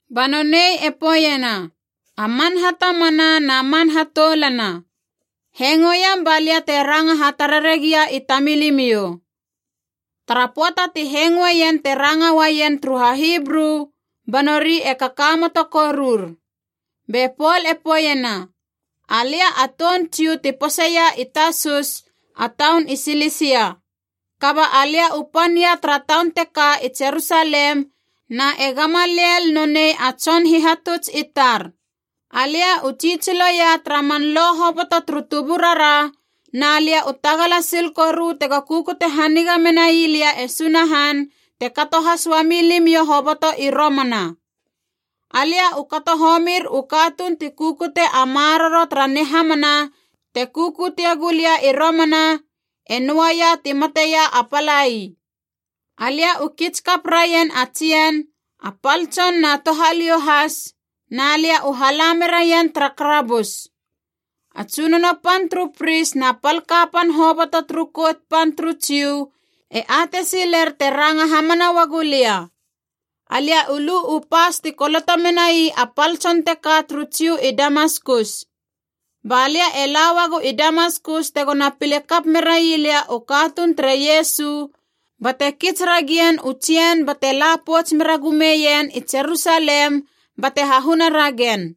Ba nonei e poeiena, “A man hatamana na man hatoulana, hengoiam ba lia te ranga hatarare gia i tamilimiou.” Tara pöata ti hengoeien te ranga uaien turu HaHibru, ba nori e kakamoto korur. Be Pol e poeiena, “Alia a toun Jiu ti poseia i Tasus, a taun i Silisia. Kaba alia u pan ia tara taun teka i Jerusalem na e Gamaliel nonei a tson hihatuts i tar. Alia u tsitsiloia tara man Lo hoboto turu tuburara, na lia u tagala sil koru tego kukute haniga menai lia e Sunahan, te kato has uami limiou hoboto i romana. Alia u kato homir u katuun ti kukute a maroro tara nihamana te kukutie gulia i romana, e noaia ti mateia a palai. Alia u kits kap raien a tsien, a pal tson na touhaliou has, na lia u hala meraien tara karabus. A tsunono pan turu pris na pal kapan hoboto turu Kout Pan turu Jiu e atei siler te ranga hamana uagu lia. Alia u lu u pas ti koloto menai a pal tson teka turu Jiu i Damaskus. Ba lia e la uagu i Damaskus tegona pile kap merai lia u katuun tere Iesu, bate kits ragien u tsien bate la pouts mera gumeien i Jerusalem bate hahuna ragen.”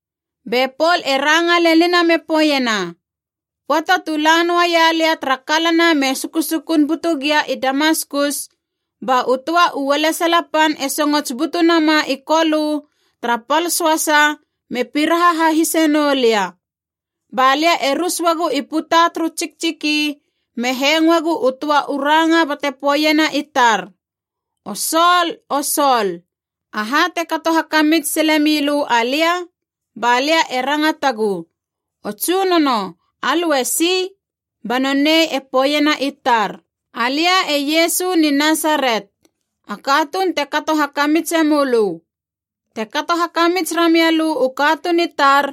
Be Pol e ranga lenina me poeiena, “Pöata tu la noaia lia tara kalana me sukusukun butu gia i Damaskus, ba u töa u ualesala pan e songots butu nama i Kolö tara pal söasa me piraha hahise noulia. Ba lia e rus uagu i puta turu tsiktsiki, me hengoegu u töa u ranga bate poeiena i tar, ‘O Sol, o Sol, aha te kato hakamits sile milö alia?’ Ba lia e rangatagu, ‘O tsunono, alö esi?’ Ba nonei e poeiena i tar, ‘Alia e Iesu ni Nasaret, a katuun te kato hakamitse mölö. Te kato hakamits ramia lö u katuun i tar,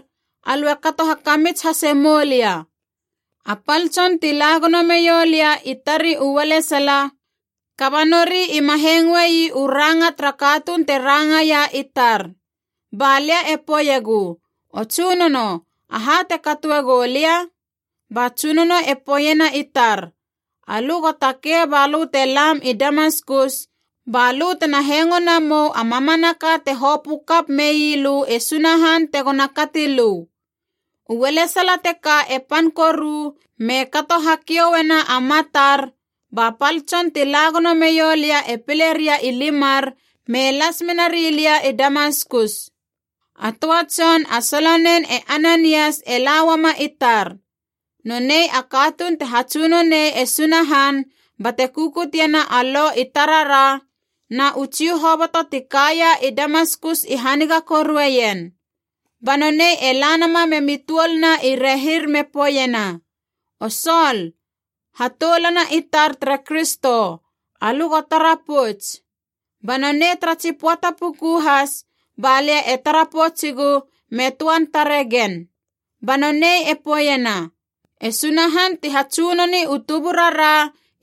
alö e kato hakamits hase moulia.’ A pal tson ti la gono meiou lia i tari u ualesala, kaba nori ima hengoi u ranga tara katuun te rangaia i tar. Ba lia e poeiegu, ‘O tsunono, aha te katoe goulia?’ Ba Tsunono e poeiena i tar, ‘Alö go takei balö te lam i Damaskus, balö tena hengo namou a mamanaka hoboto te hopö kap mei lö e Sunahan tegona kati lö.’ U ualesala teka e pan koru me kato hakiouena a matar, ba pal tson ti la gono meiou lia e pile ria i limar me las mena rilia i Damaskus. “A töa tson a solonen e Ananias e la uama i tar. Nonei a katuun te hatsunonei e Sunahan bate kukutiena a Lo i tarara, na u Jiu hoboto ti kaia i Damaskus i haniga korueien. Ba nonei e la nama memi tuoluna i rehir me poeiena, ‘O Sol, hatoulana i tar tere Kristo, alö go tara pouts!’ Ba nonei tara tsi poata puku has balia e tara poutsigu me töan tare gen. Ba nonei e poeiena, ‘E Sunahan ti hatsunoni u tuburara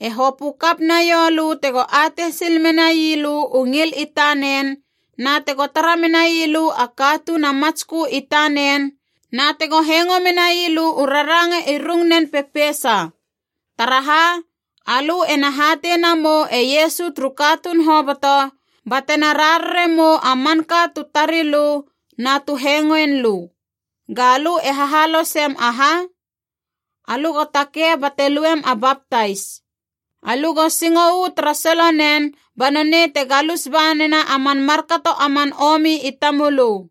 e hopö kap naiou lö tego atei sil menai lö u ngil i tanen, na tego tara menai lö a Katuun a Matskö i tanen, na tego hengo menai lö u raranga i rung nen pepeisa. Taraha, alö ena hatei namou e Iesu turu katuun hoboto, ba tena rarare mou a manka tu tari lö na tu hengoin lö. Ga lö e hahalosem aha? Alö go takei bate luem a baptais. Alö go singo uu tara solonen ba nonei te galus ba nena a man markato a man omi i tamölö.’”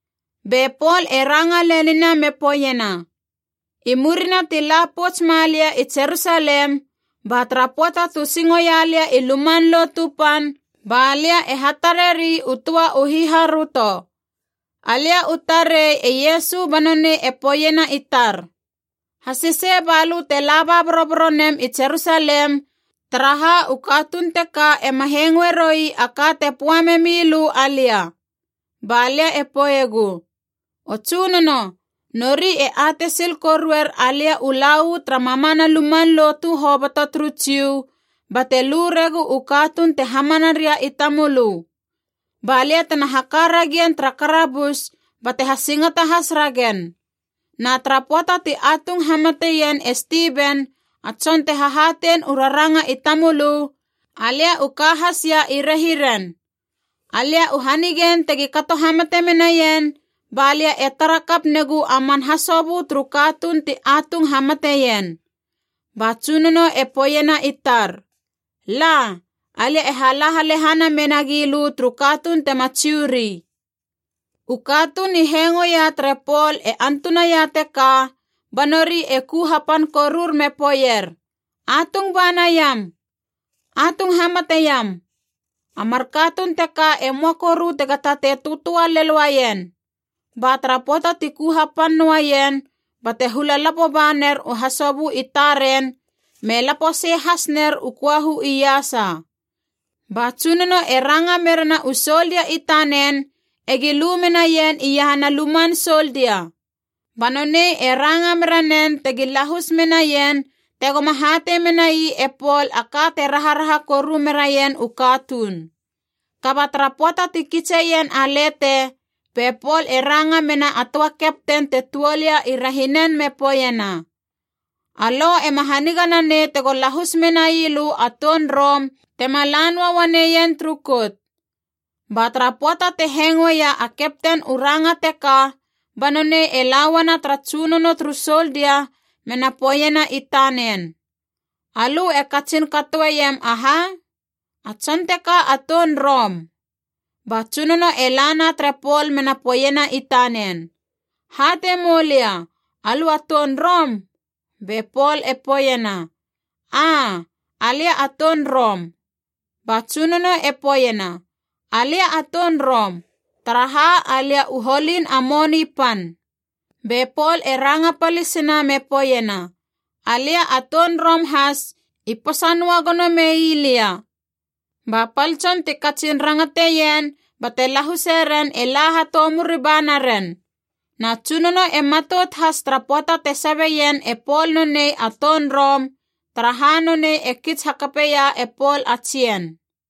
Be Pol e ranga lenina me poeiena, “I murina ti la pouts malia i Jerusalem, ba tara pöata tu singo ia lia i Luman Lotu Pan balia e hatareri u töa u hiharöto. Alia u tarei e Iesu ba nonei e poeiena i tar, ‘Hasesei balö te laba boroboro nem i Jerusalem, taraha u katuun teka ema hengoe roui a ka te poa memi lö alia.’ Ba lia e poeiegu, ‘O Tsunono, nori e atei sil koruer alia u la uu tara mamana luman lotu hoboto turu Jiu bate lu regu u katuun te hamana ria i tamölö. Ba lia tena haka ragien tara karabus bate hasingata has ragen. Na tara pöata ti atung hamateien e Stiven, a tson te hahatein u raranga i tamölö, alia u ka has ia i rehiren. Alia u hanigein tegi kato hamate menaien, balia e tara kap negu a man hasobö turu katuun ti atung hamateien.’ Ba Tsunono e poeiena i tar, ‘La, alia e hala halehana menagi lö turu katuun tema Jiu ri.’” U katuun i hengoia tere Pol e antunaia teka, ba nori e ku hapan korur me poeier, “Atung ba naiam! Atung hamate iam! A mar katuun teka e möa koru tega tatei töatöa lel uaien!” Ba tara pöata ti ku hapan noaien bate hula lapo ba ner u hasobö i taren me lapo sei has ner u köahu iasa. Ba tsunono e ranga merena u soldia i tanen egi lu menaien iahana luman soldia. Ba nonei e ranga mera nen tegi lahus menaien tegoma hatei menai e Pol a ka te raharaha koru meraien u katuun. Kaba tara pöata ti kitseien a lete, be Pol e ranga mena a töa kapten te tuol ia i rehinen me poeiena, “A lo ema haniga nanei tego lahus menai lö a toun Rom tema la noa uaneien turu kout.” Ba tara pöata te hengoeia a kapten u ranga teka ba nonei e lauana tara tsunono turu soldia mena poeiena i tanen, “Alö e katsin katoeiem aha? A tson teka a toun Rom!” Ba tsunono e lana tere Pol mena poeiena i tanen, “Hatei moulia, alö a toun Rom?” Be Pol e poeiena, “Aa alia a toun Rom.” Ba tsunono e poeiena “Alia a toun Rom, taraha alia u holin a moni pan.” Be Pol e ranga palisina me poeiena, “Alia a toun Rom has, i posa noa gono meilia.” Ba pal tson ti katsin rangateien bate lahuse ren e la hatoumuri ba naren. Na tsunono e matout has tara pöata te sabe ien e Pol nonei a toun Rom, taraha nonei e kits hakapeia e Pol a tsien.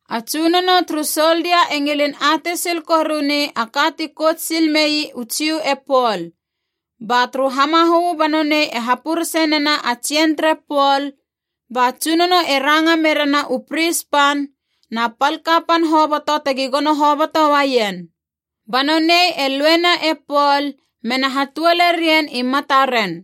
A tsunono turu soldia e ngilin atei sil koruni a ka ti kout sil mei u Jiu e Pol. Ba turu hamahö ba nonei e hapurese nena a tsien tere Pol, ba tsunono e ranga merena u pris pan na pal kapan hoboto tegi gono hoboto uaien. Ba nonei e luena e Pol mena hatuole rien i mataren.